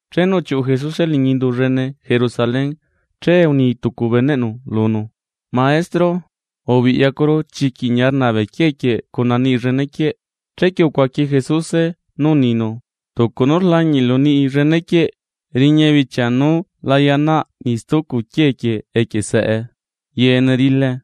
Chenu uchiuꞌu Jesuse liñi indu llene Jerusalén, che uni tucu beneꞌnu lunu: ―¡Maestro, ubiꞌyacuru chiquiꞌ ñia rnaa bee quiee quieꞌ cuna niꞌi llene quieꞌ! Chequie ucuaqui Jesuse nú uninu: ―Tucu nú rlañiꞌlu niꞌi llene quieꞌ, riña bichia nú la yaꞌnaꞌ niꞌ stucu quiee quieꞌ equie saꞌe yeene rilae.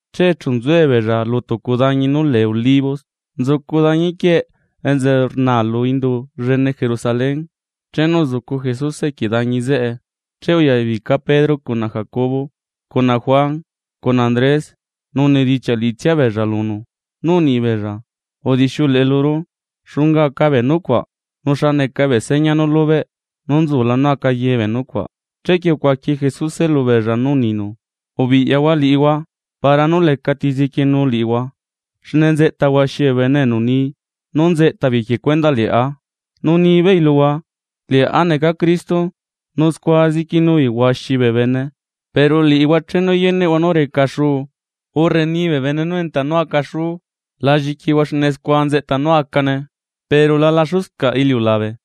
Che chu nzuebeella lu tucu dañi nú lee Olivos nzucu dañi quieꞌ enza rna lu indu llene Jerusalén, chenu uzucu Jesuse equie dañi zeꞌe, che uyabica Pedro cuna Jacobo cuna Juan cuna Andrés nu unidichiaꞌ liꞌitsia beella lunu nú unibeella: ―Udixiuleꞌe luru, ¿xunga aca bee nucuaꞌ? ¿Nu xa neca bee seña nú lubeꞌ nú nzula nú aca ye bee nucuaꞌ? Chequie ucuaqui Jesuse lubeella nú uninu: ―Ubiꞌyahua liꞌihua, para nú lecati zequienu liꞌihua. Xne nzeꞌta huaxi bee bene enu ni nú nzeꞌta beei equie cuendaꞌ liꞌá nu nibeei luhua: “Liꞌá neca Cristo”; nu scua zequienu beei huaxi bee bene. ’Pero liꞌihua chenu yeneꞌhua nú reca xuu urre rni bee bene nú enta nú aca xuu, la lliquihua xne scua nzeꞌta nú acane, pero la laxuscaꞌ iliulabe.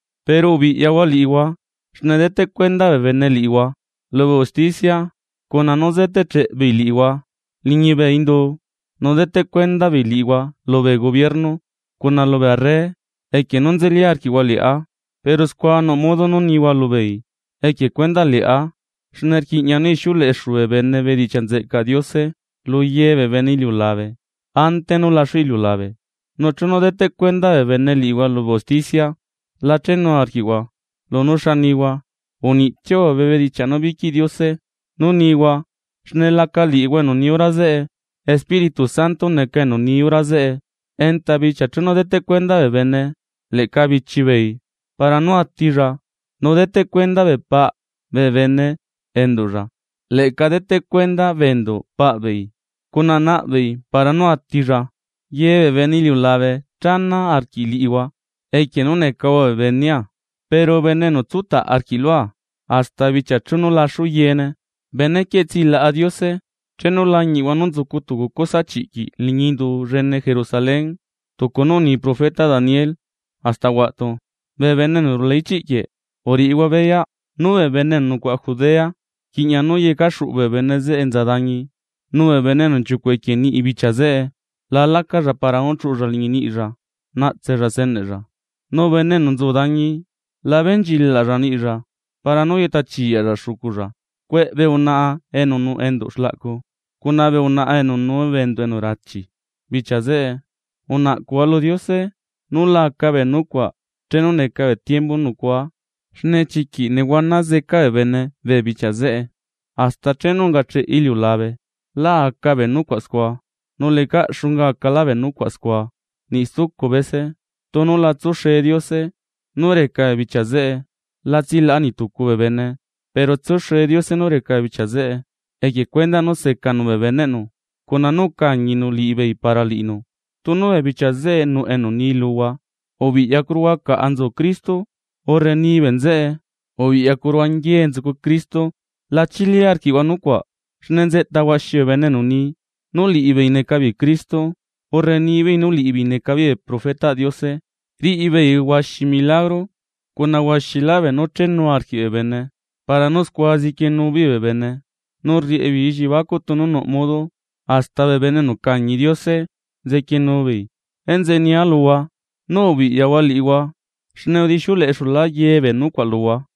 ’Pero ubiꞌyahua liꞌihua xne deteꞌ cuenda bee bene liꞌihua lubee usticia, cuna nú zetecheꞌ beei liꞌihua liñi bee indu, nu deteꞌ cuenda beei liꞌihua lubee gubierno cuna lubee arre equie nú nzeli arquiꞌhua liꞌá, pero scua nuꞌ modo nú nihua lubeei equie cuendaꞌ liꞌá. Xne rquiꞌña nú ixiuleꞌexu bee bene bedichiaꞌ nzeꞌcaꞌ Diose lu ye bee bene iliulabe, ante nú laxu iliulabe. Nu chenu deteꞌ cuenda bee bene liꞌihua lubee usticia, la chenu arquiꞌhua lunú xa nihua, uniꞌtsiahua bee bedichiaꞌ nú liquiꞌ Diose nú nihua xne laca liꞌihua enu ni hora zeꞌe, Espíritu Santo neca enu ni hora zeꞌe. Enta bichia chenu deteꞌ cuenda bee bene leꞌca bichi beei para nú atilla, nu deteꞌ cuenda bee paꞌ bee bene enduꞌlla, leꞌca deteꞌ cuenda bee enduꞌ bee paꞌ beei cuna naꞌbeei para nú atilla. Ye bee bene iliulabe chana arquiꞌ liꞌihua equie nú necahua bee benea; pero bene enu tsutaꞌ arquiꞌ lua hasta bichia chenu laxu yeene, benequieꞌ tsilaꞌa Diose. ’Chenu lañiꞌhua nú nzucu tucu cosa chiꞌquiꞌ liñi indu llene Jerusalén, tucu nú uni profeta Daniel hasta huaꞌtu, (bee bene enu rula ichiꞌ quieꞌ, uriꞌihua beyaꞌ) nú bee bene enu nucuaꞌa Judea, rquiꞌña nú yeca xuꞌu bee bene zeꞌe enza dañi. Nu bee bene enu nchiucuꞌ equie niꞌi bichia zeꞌe, la lluꞌchaꞌ lacalla para nú chuꞌulla liñi niꞌilla naꞌtsella steneꞌlla. Nu bene enu nzu dañi, la benchilaꞌlla niꞌlla para nú yeꞌta chiyaꞌlla xuculla. ¡Cueꞌe bee unaꞌa enu nuꞌ enduꞌ xlaꞌcu, cuna bee unaꞌa enu nuu bee enduꞌ enu rachi bichia zeꞌe! Unaꞌcuꞌhua lu Diose nú la aca bee nucuaꞌ chenu neca tiembu nú nucuaa. Xne chiquiꞌ nehuana zeca bee bene bichia zeꞌe, hasta chenu ungacheꞌ iliulabe lá aca bee nucuaꞌ scua, nu lecaꞌ xunga acalá bee nucuaꞌ scua niꞌ stucu bese. Tunu la tsuxe Diose nú reca bee bichia zeꞌe, la tsilaꞌa niꞌ tucu bee bene; pero tsuxe Diose nú reca bee bichia zeꞌe, equie cuendaꞌ nú secanu bee beneꞌnu cuna nú ucañinu liꞌibeei para liꞌinu. ’Tunu bee bichia zeꞌe nuꞌ enu ni luhua: “Ubiꞌyacuruhua caꞌa nzucu Cristo”, urre “Ni bee nzeꞌe ubiꞌyacuruhua nguiee nzucu Cristo”, la chili arquiꞌhua nucuaꞌ. Xne nzeꞌta huaxi bee bene enu ni nú liꞌibeei neca beei Cristo, urre nibeei nú liꞌibeei neca beei bee profetaꞌ Diose, riꞌi beei huaxi bee milagro, cuna huaxilá beenú chenu arquiꞌ bee bene, para nú scua zequienu beei bee bene nu rriꞌi beei elliebacuꞌ tunu nuꞌ modo hasta bee bene enu ucañi Diose, zequienu beei. Enzeꞌe nia luhua, nú ubiꞌyahua liꞌihua, xne udixiuleꞌexulá ye bee nucuaꞌ luhua.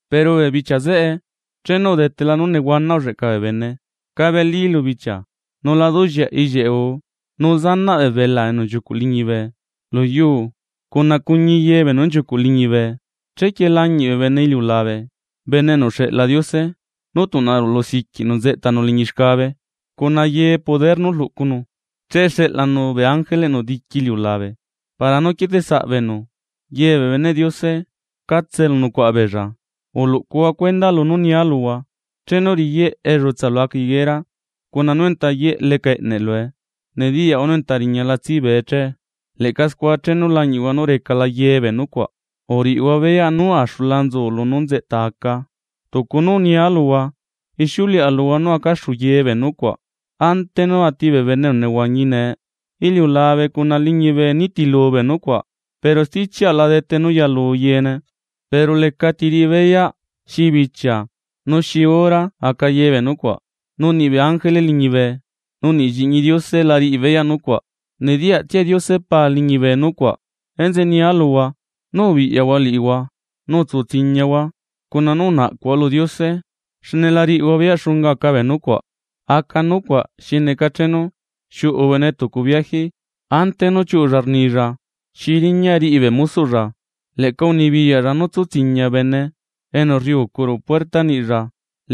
’Pero bee bichia zeꞌe, chenu udetela nú nehuana ulleꞌca bee bene cabelí lu bichia, nu la duꞌlleaꞌ ellieꞌ guu, nu zanaꞌ bee belaa enu nchiucuꞌ liñibe lu yuu cuna cuñi ye beenu nchiucuꞌ liñibe. Chequie lañiꞌ bee bene iliulabe, Bene enu uxeꞌla Diose, nú tuꞌna rulu siquiꞌnu nzeꞌtanu liñi xcabe cuna ye poder nú rluꞌcunu. Che xeꞌlanu bee ángeleꞌnu diqui lu iliulabe para nú quieteꞌsaꞌ beenu, ye bee beneꞌ Diose catse elu nucuaꞌa beella. ’Uluꞌcuhua cuenda lunú nia luhua, chenu riyeꞌ ellutsa lu aca higuera, cuna nú enta yeꞌ leca eꞌneꞌ lue, nediyaꞌhua nú enta riñala tsibee che. Leꞌca scua chenu lañiꞌhua nú recala ye bee nucuaꞌ uriꞌihua beyaꞌ nú axula nzu lunú nzeꞌta aca tucu nú unia luhua. Ixiuleꞌa luhua nú acaxu ye bee nucuaꞌ, ante nú ati bee bene enu nehuañi nee. Iliulabe cuna liñibe nitilu bee nucuaꞌ pero stichiaꞌa la dete nú yalu yeene. ’Pero lecati riꞌi beyaꞌ xi bichia nu xi hora nú aca ye bee nucuaꞌ, nu niꞌbee ángele liñibe nu niꞌ Lliꞌñi Diose la riꞌi beyaꞌ nucuaꞌ, nediyaꞌtsia Diose Pa liñibe nucuaꞌ. ’Enzeꞌe nia luhua nú ubiꞌyahua liꞌihua nu utsu tsiñiahua cuna nú unaꞌcuhua lu Diose, xne la riꞌihua beyaꞌ xunga aca bee nucuaꞌ. Aca nucuaꞌ xi neca chenu xiuꞌu bene tucu biaji. Ante nú chiuꞌulla rnilla xi riñaꞌ riꞌi bee mosoꞌlla. Leꞌca unibiyaꞌlla nú tsu tsiña bene enu rriucu ruꞌu puerta niꞌilla.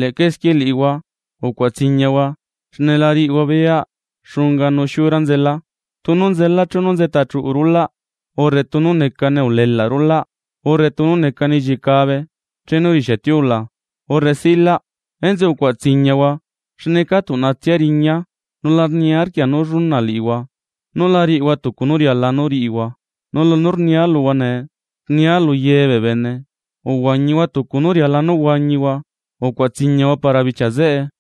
Leꞌca esquie liꞌihua, ucuaꞌa tsiñahua, xne la riꞌihua beyaꞌ xunga nu xiura nzelaa, tunu nzelaa chenu nzeꞌta chuꞌu rulaꞌ, urre tunu necane ulelaꞌ rulaꞌ urre tunu necane ellicabe chenu rixia tiula urre silaꞌ. Enzeꞌe ucuaꞌa tsiñahua xne ca tuꞌnatsia riñaa, nu la niarquia nú lluna liꞌihua nú la riꞌihua tucu nú riala nú riꞌihua. Nu lunú rnia luhua nee, rnia lu ye bee bene: Uhuañihua tucu nú riala nú huañihua, ¡ucuaꞌa tsiñahua para bichia zeꞌe!